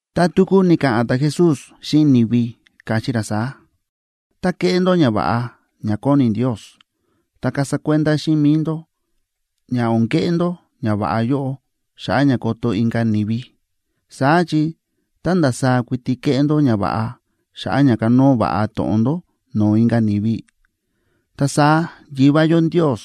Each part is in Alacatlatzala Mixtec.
Ta tuku ni̱ka̱ꞌa̱n ta̱Jesús xíꞌin ni̱vi, káchí ra saá: ―Tá kéꞌé ndó ñava̱ꞌa ña kóni Ndios, ta kasa kuenda xíꞌin mi̱i ndó ña o̱n keꞌé ndó ñava̱ꞌa yóꞌo xa̱ꞌa̱ ña koto inka̱ ni̱vi. Saá chi tá ndasaá kuiti kéꞌé ndó ñava̱ꞌa xa̱ꞌa̱ ña kanóo va̱ꞌa to̱ꞌon ndó no̱o̱ inka̱ ni̱vi, ta saá Yivá yó Ndios,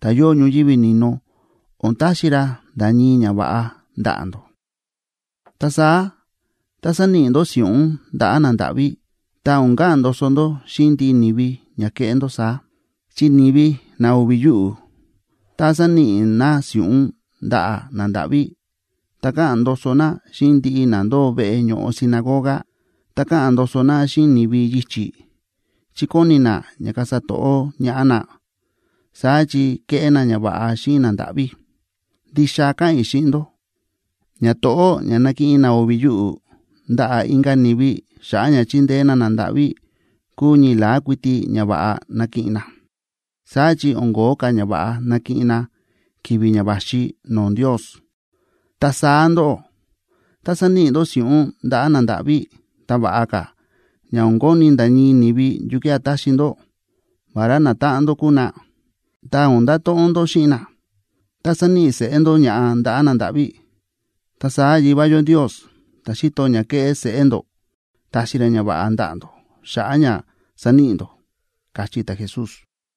ta̱ yóo ñoyívi ni̱no, o̱n taxi ra nda̱ ñii ñava̱ꞌa ndaꞌa̱ ndó. Ta saá, tá sáníꞌi ndó si̱ꞌún ndaꞌa̱ nandáꞌví, ta o̱n ka̱ꞌa̱n ndoso ndó xíꞌin ndiꞌi ni̱vi ña kéꞌé ndó saá. Chi ni̱vi na o̱vi̱ yuꞌu̱, tá sáníꞌi na si̱ꞌún ndaꞌa̱ nandáꞌví, ta káꞌa̱n ndoso na xíꞌin ndiꞌi na ndóo veꞌe ño̱ꞌo sinagoga, ta káꞌa̱n ndoso na xíꞌin ni̱vi yichi̱, chi kóni na ña kasa to̱ꞌó ñaꞌá na, saá chi kéꞌé na ñava̱ꞌa xíꞌin nandáꞌví. Ndixa káꞌa̱n i̱ xíꞌin ndó, ñato̱ꞌó ña nákiꞌin na o̱vi̱ yuꞌu̱ ndaꞌa̱ inka̱ ni̱vi xa̱ꞌa̱ ña chíndeé na nandáꞌví, kúu ñii la̱á kuiti ñava̱ꞌa nakiꞌin na; saá chi o̱n ko̱ó ka̱ ñava̱ꞌa nakiꞌin na ki̱vi̱ ña va̱xi no̱o̱ Ndios. Ta saá ndóꞌó, tá sáníꞌi ndó si̱ꞌún ndaꞌa̱ nandáꞌví, ta va̱ꞌa ka̱ ña o̱n koni̱ nda̱ ñii ni̱vi yukía̱ taxi ndó, vará natáꞌan ndó kúu na, ta o̱n ndato̱ꞌon ndó xíꞌin na, ta saníꞌi seꞌé ndó ña̱ꞌa ndaꞌa̱ nandáꞌví. Ta saá Yivá yó Ndios, ta̱ xíto ña kéꞌé seꞌé ndó, taxi ra ñava̱ꞌa ndaꞌa̱ ndó xa̱ꞌa̱ ña sa̱níꞌi ndó ―káchí ta̱Jesús.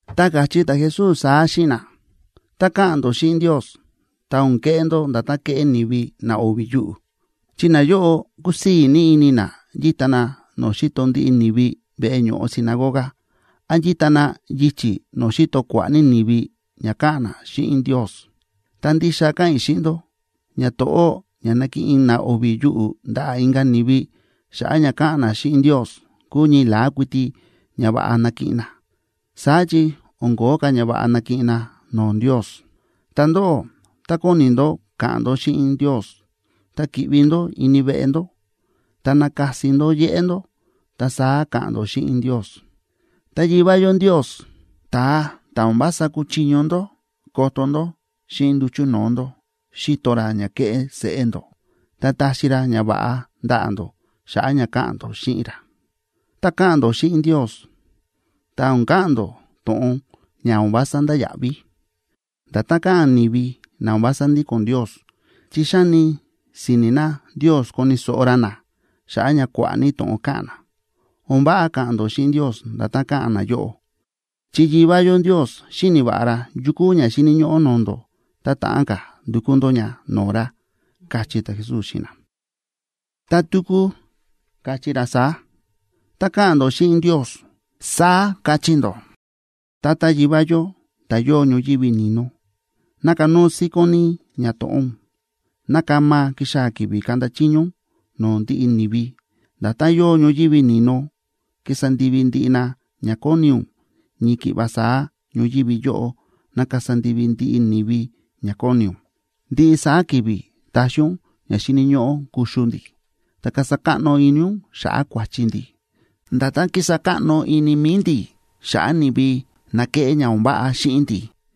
Ta káchí ta̱Jesús saá xíꞌin na: ―Tá káꞌa̱n ndó xíꞌin Ndios, ta o̱n keꞌé ndó nda̱tán kéꞌé ni̱vi na o̱vi̱ yuꞌu̱. Chi nayóꞌo kúsii̱ ní ini na yíta na no̱o̱ xíto ndiꞌi ni̱vi veꞌe ño̱ꞌo sinagoga, án yíta na yichi̱ no̱o̱ xíto kua̱ꞌa̱ ní ni̱vi ña káꞌa̱n na xíꞌin Ndios. Ta ndixa káꞌa̱n i̱ xíꞌin ndó, ñato̱ꞌó ña nákiꞌin na o̱vi̱ yuꞌu̱ ndaꞌa̱ inka̱ ni̱vi xa̱ꞌa̱ ña káꞌa̱n na xíꞌin Ndios, kúu ñii la̱á kuiti ñava̱ꞌa nakiꞌin na; saá chi o̱n ko̱ó ka̱ ñava̱ꞌa nakiꞌin na no̱o̱ Ndios. Ta ndóꞌó, tá kóni ndó ka̱ꞌa̱n ndó xíꞌin Ndios, ta ki̱ꞌvi ndó ini veꞌe ndó, ta nakasi ndó yéꞌé ndó, ta saá ka̱ꞌa̱n ndó xíꞌin Ndios. Ta Yivá yó Ndios, ta̱a ta̱ o̱n vása kúchiño ndó koto ndó xíꞌin nduchu̱ no̱o̱ ndó, xíto ra ña kéꞌé seꞌé ndó, ta taxi ra ñava̱ꞌa ndaꞌa̱ ndó xa̱ꞌa̱ ña káꞌa̱n ndó xíꞌin ra. ’Tá káꞌa̱n ndó xíꞌin Ndios, ta o̱n ka̱ꞌa̱n ndó to̱ꞌon ña o̱n vása ndáya̱ꞌví, nda̱tán káꞌa̱n ni̱vi na o̱n vása ndíko̱n Ndios, chi xáni si̱ni̱ na Ndios koni̱ so̱ꞌo ra na xa̱ꞌa̱ ña kua̱ꞌa̱ ní to̱ꞌon káꞌa̱n na. O̱n váꞌa ka̱ꞌa̱n ndó xíꞌin Ndios nda̱tán káꞌa̱n nayóꞌo, chi Yivá yó Ndios xíni̱ va̱ꞌa ra yu kúu ña xíni̱ ñóꞌó no̱o̱ ndó ta ta̱ꞌán ka̱ ndukú ndó ña no̱o̱ ra ―káchí ta̱Jesús xíꞌin na. Ta tuku káchí ra saá: ―Tá káꞌa̱n ndó xíꞌin Ndios, saá kachí ndó: Tata Yivá yó, ta̱ yóo ñoyívi ni̱no, ná kanóo síkón ní ñato̱ꞌó ún. Ná kama kixaa̱ ki̱vi̱ kaꞌnda chiño ún no̱o̱ ndiꞌi ni̱vi. Nda̱tán yóo ñoyívi ni̱no kísa ndivi ndiꞌi na ña kóni ún, ñii ki̱ꞌva saá ñoyívi yóꞌo ná kasa ndivi ndiꞌi ni̱vi ña kóni ún. Ndiꞌi saá ki̱vi̱ taxi ún ña xíni̱ ñóꞌó kuxu ndi̱. Ta kasa káꞌno ini ún xa̱ꞌa̱ kua̱chi ndi̱, nda̱tán kísa káꞌno ini mi̱i ndi̱ xa̱ꞌa̱ ni̱vi na kéꞌé ña o̱n váꞌa xíꞌin ndi̱.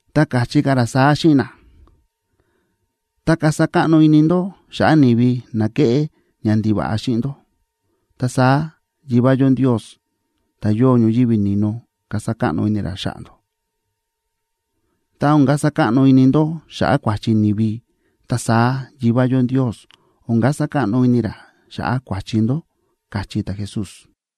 Ta káchí ka̱ ra saá xíꞌin na: ―Tá kasa káꞌno ini ndó xa̱ꞌa̱ ni̱vi na kéꞌé ñandiva̱ꞌa xíꞌin ndó, ta saá Yivá yó Ndios, ta̱ yóo ñoyívi ni̱no, kasa káꞌno ini ra xa̱ꞌa̱ ndó. Tá o̱n kasa káꞌno ini ndó xa̱ꞌa̱ kua̱chi ni̱vi, ta saá Yivá yó Ndios o̱n kasa káꞌno ini ra xa̱ꞌa̱ kua̱chi ndó ―káchí ta̱Jesús.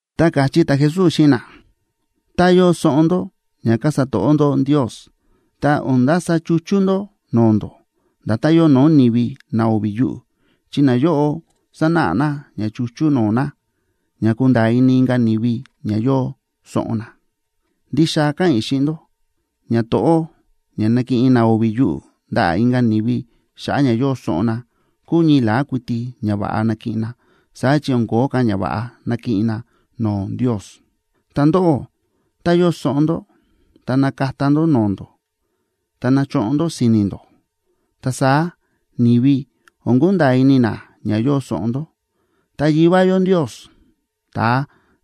Ta káchí ta̱Jesús xíꞌin na: ―Tá yóo soꞌon ndó ña kasa to̱ꞌó ndó Ndios, ta o̱n ndasa chuchú ndó no̱o̱ ndó, nda̱tán yóo no̱o̱ ni̱vi na o̱vi̱ yuꞌu̱, chi nayóꞌo sánáꞌa na ña chuchú no̱o̱ na, ña kunda̱a̱ ini inka̱ ni̱vi ña yóo soꞌon na. Ndixa káꞌa̱n i̱ xíꞌin ndó, ñato̱ꞌó ña nákiꞌin na o̱vi̱ yuꞌu̱ ndaꞌa̱ inka̱ ni̱vi xa̱ꞌa̱ ña yóo soꞌon na, kúu ñii la̱á kuiti ñava̱ꞌa nakiꞌin na; saá chi o̱n ko̱ó ka̱ ñava̱ꞌa nakiꞌin na no̱o̱ Ndios. Ta ndóꞌó, tá yóo soꞌon ndó, ta nakata ndó no̱o̱ ndó, ta nachoꞌon ndó si̱ni̱ ndó. Ta saá ni̱vi o̱n kunda̱a̱ ini na ña yóo soꞌon ndó. Ta Yivá yó Ndios, ta̱a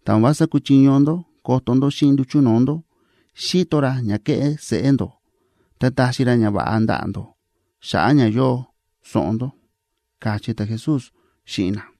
ta̱ o̱n vása kúchiño ndó koto ndó xíꞌin nduchu̱ no̱o̱ ndó, xíto ra ña kéꞌé seꞌé ndó, ta taxi ra ñava̱ꞌa ndaꞌa̱ ndó xa̱ꞌa̱ ña yóo soꞌon ndó ―káchí ta̱Jesús xíꞌin na.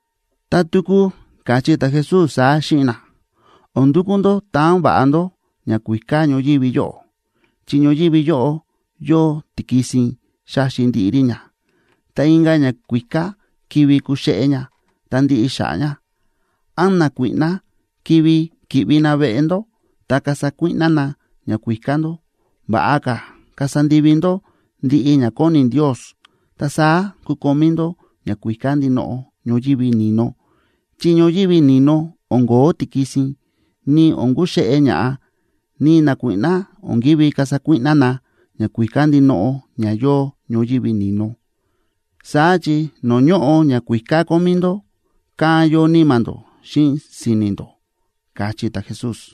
Ta tuku káchí ta̱Jesús saá xíꞌin na: ―O̱n ndukú ndó taan va̱ꞌa ndó ñakuíká ñoyívi yóꞌo, chi ñoyívi yóꞌo yóo tikisin xáxi ndiꞌi rí ña, ta inka̱ ñakuíká kivi kuxéꞌé ña ta ndiꞌi xa̱ꞌa̱ ña, án nakuíꞌná kivi ki̱ꞌvi na veꞌe ndó ta kasa kuíꞌná na ñakuíká ndó. Va̱ꞌa ka̱ kasa ndivi ndó ndiꞌi ña kóni Ndios, ta saá kukomí ndó ñakuíká ndinoꞌo ñoyívi ni̱no, chi ñoyívi ni̱no o̱n ko̱ó tikisin, ni o̱n kuxéꞌé ña̱ꞌa, ni nakuíꞌná o̱n ki̱ví kasa kuíꞌná na ñakuíká ndinoꞌo ña yóo ñoyívi ni̱no. Saá chi no̱o̱ ñóꞌo ñakuíká kómí ndó, kán yóo níma̱ ndó xíꞌin si̱ni̱ ndó ―káchí ta̱Jesús.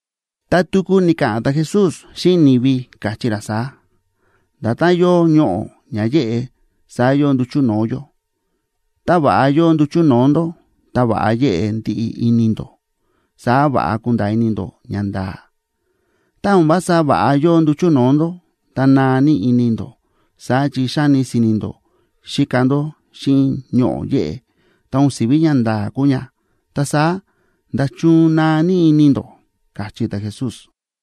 Ta tuku ni̱ka̱ꞌa̱n ta̱Jesús xíꞌin ni̱vi, káchí ra saá: ―Nda̱tán yóo ñoꞌo̱ ña yéꞌe, saá yóo nduchu̱ no̱o̱ yó. Tá va̱ꞌa yóo nduchu̱ no̱o̱ ndó, ta va̱ꞌa yéꞌe ndiꞌi ini ndó, saá va̱ꞌa kunda̱a̱ ini ndó ñanda̱a̱. Tá o̱n vása va̱ꞌa yóo nduchu̱ no̱o̱ ndó, ta naa ní ini ndó. Saá chi xáni si̱ni̱ ndó xíka ndó xíꞌin ñoꞌo̱ yéꞌe, ta o̱n si̱ví ñanda̱a̱ kúu ña. Ta saá, ¡nda̱chun naa ní ini ndó! ―káchí ta̱Jesús.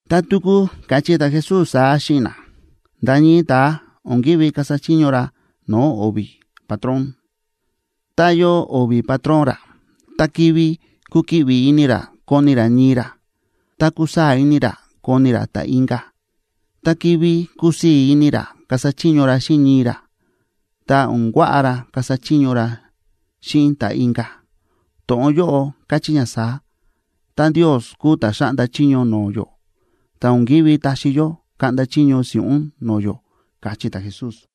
Ta tuku káchí ta̱Jesús saá xíꞌin na: ―Nda̱ ñii ta̱a o̱n ki̱ví kasa chiño ra no̱o̱ o̱vi̱ patrón. Tá yóo o̱vi̱ patrón ra, ta kivi kukiꞌvi ini ra koni ra ñii ra, ta kusaa̱ ini ra koni ra ta̱ inka̱. Ta kivi kusii̱ ini ra kasa chiño ra xíꞌin ñii ra, ta o̱n kuaꞌa ra kasa chiño ra xíꞌin ta̱ inka̱. To̱ꞌon yóꞌo káchí ña saá: Tá Ndios kúu ta̱ xáꞌnda chiño no̱o̱ yó, ta o̱n ki̱ví taxi yó kaꞌnda chiño si̱ꞌún no̱o̱ yó ―káchí ta̱Jesús.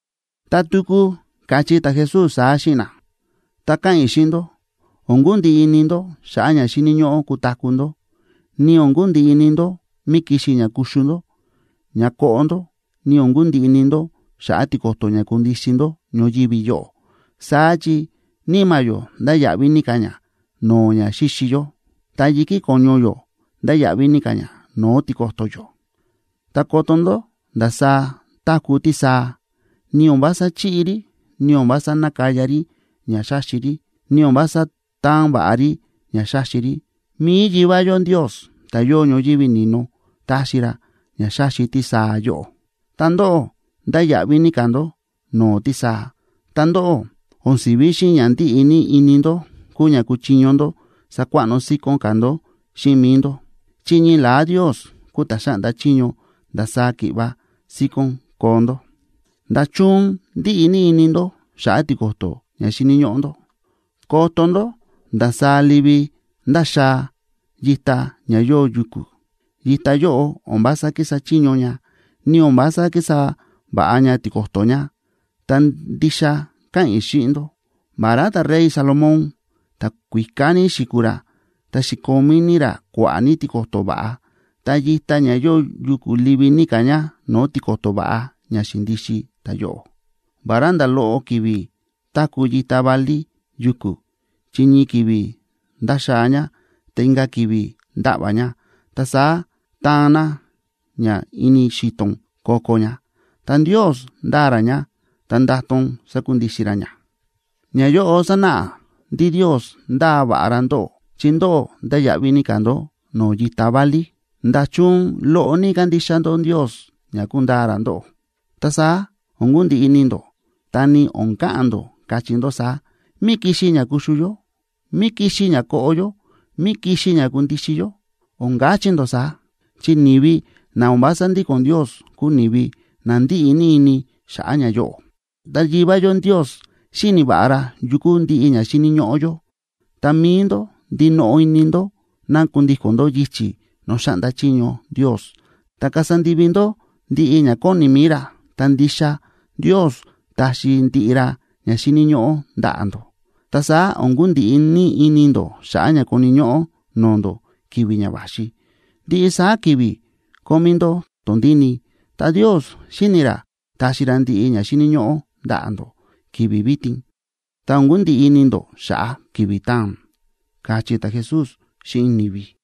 Ta tuku káchí ta̱Jesús saá xíꞌin na: ―Ta káꞌa̱n i̱ xíꞌin ndó, o̱n kundiꞌi ini ndó xa̱ꞌa̱ ña xíni̱ ñóꞌó kutaku̱ ndó, ni o̱n kundiꞌi ini ndó mí kixi ña kuxu ndó, ña koꞌo ndó, ni o̱n kundiꞌi ini ndó xa̱ꞌa̱ tiko̱to̱ ña kundixin ndó ñoyívi yóꞌo, saá chi níma̱ yó ndáya̱ꞌví ní ka̱ ña no̱o̱ ña xíxi yó, ta yi̱kí ko̱ñu yó ndáya̱ꞌví ní ka̱ ña no̱o̱ tiko̱to̱ yó. Ta koto ndó ndasaá táku̱ tísaa, ni o̱n vása chíꞌi rí, ni o̱n vása nákaya rí ña xáxi rí, ni o̱n vása táan va̱ꞌa rí ña xáxi rí. Mi̱i Yivá yó Ndios, ta̱ yóo ñoyívi ni̱no, táxi ra ña xáxi tísaa yóꞌo. Ta ndóꞌó, ndáya̱ꞌví ní ka̱ ndó no̱o̱ tísaa. Ta ndóꞌó, o̱n si̱ví xíꞌin ña ndíꞌi ní ini ndó kúu ña kúchiño ndó sakuaꞌno síkón ka̱ ndó xíꞌin mi̱i ndó, chi ñii la̱á Ndios kúu ta̱ xáꞌnda chiño ndasaá ki̱ꞌva síkón koo ndó. ’¿Nda̱chun ndíꞌi ini ndó xa̱ꞌa̱ tiko̱to̱ ña xíni̱ ñóꞌó ndó? Koto ndó ndasaá livi ndáxaa yita ña yóo yuku̱; yita yóꞌo o̱n vása kísa chiño ña, ni o̱n vása kísa va̱ꞌa ña tiko̱to̱ ña. Ta ndixa káꞌa̱n i̱ xíꞌin ndó, vará ta̱rey Salomón, ta̱kuíká ní xi̱kuu ra, ta xi̱komí ní ra kua̱ꞌa̱ ní tiko̱to̱ va̱ꞌa, ta yita ña yóo yuku̱ livi ní ka̱ ña no̱o̱ tiko̱to̱ va̱ꞌa ña xi̱ndixin ta̱yóꞌo. Vará nda̱ loꞌo ki̱vi̱ táku̱ yita válí yuku̱, chi ñii ki̱vi̱ ndáxaa ña, ta inka̱ ki̱vi̱ ndáꞌva̱ ña, ta saá taan na ña ini xi̱to̱n ko̱ko̱ ña, ta Ndios ndáa ra ña, ta ndátón sákundixin ra ña. Ñayóꞌo sánáꞌa ndí Ndios ndáa va̱ꞌa ra ndóꞌó, chi ndóꞌó ndáya̱ꞌví ní ka̱ ndó no̱o̱ yita válí. ¿Nda̱chun loꞌo ní kándixa ndó Ndios ña kundaa ra ndóꞌó? Ta saá o̱n kundiꞌi ini ndó, ta ni o̱n ka̱ꞌa̱n ndó, kachí ndó saá: “¿Mí kixi ña kuxu yó? ¿Mí kixi ña koꞌo yó? ¿Mí kixi ña kundixin yó?”, o̱n kachí ndó saá. Chi ni̱vi na o̱n vása ndíko̱n Ndios kúu ni̱vi na ndíꞌi ní ini xa̱ꞌa̱ ñayóꞌo. Ta Yivá yó Ndios xíni̱ va̱ꞌa ra yu kúu ndiꞌi ña xíni̱ ñóꞌó yó. Ta mi̱i ndó, ndinoꞌo ini ndó ná kundíko̱n ndó yichi̱ no̱o̱ xáꞌnda chiño Ndios, ta kasa ndivi ndó ndiꞌi ña kóni mi̱i ra, ta ndixa Ndios taxi ndiꞌi ra ña xíni̱ ñóꞌó ndaꞌa̱ ndó. Ta saá o̱n kundiꞌi ní ini ndó xa̱ꞌa̱ ña koni̱ ñóꞌó no̱o̱ ndó ki̱vi̱ ña va̱xi. Ndiꞌi saá ki̱vi̱ kómí ndó tondíni, ta Ndios xíni̱ ra taxi ra ndiꞌi ña xíni̱ ñóꞌó ndaꞌa̱ ndó ki̱vi̱ vitin. Ta o̱n kundiꞌi ini ndó xa̱ꞌa̱ ki̱vi̱ taa̱n ―káchí ta̱Jesús xíꞌin ni̱vi.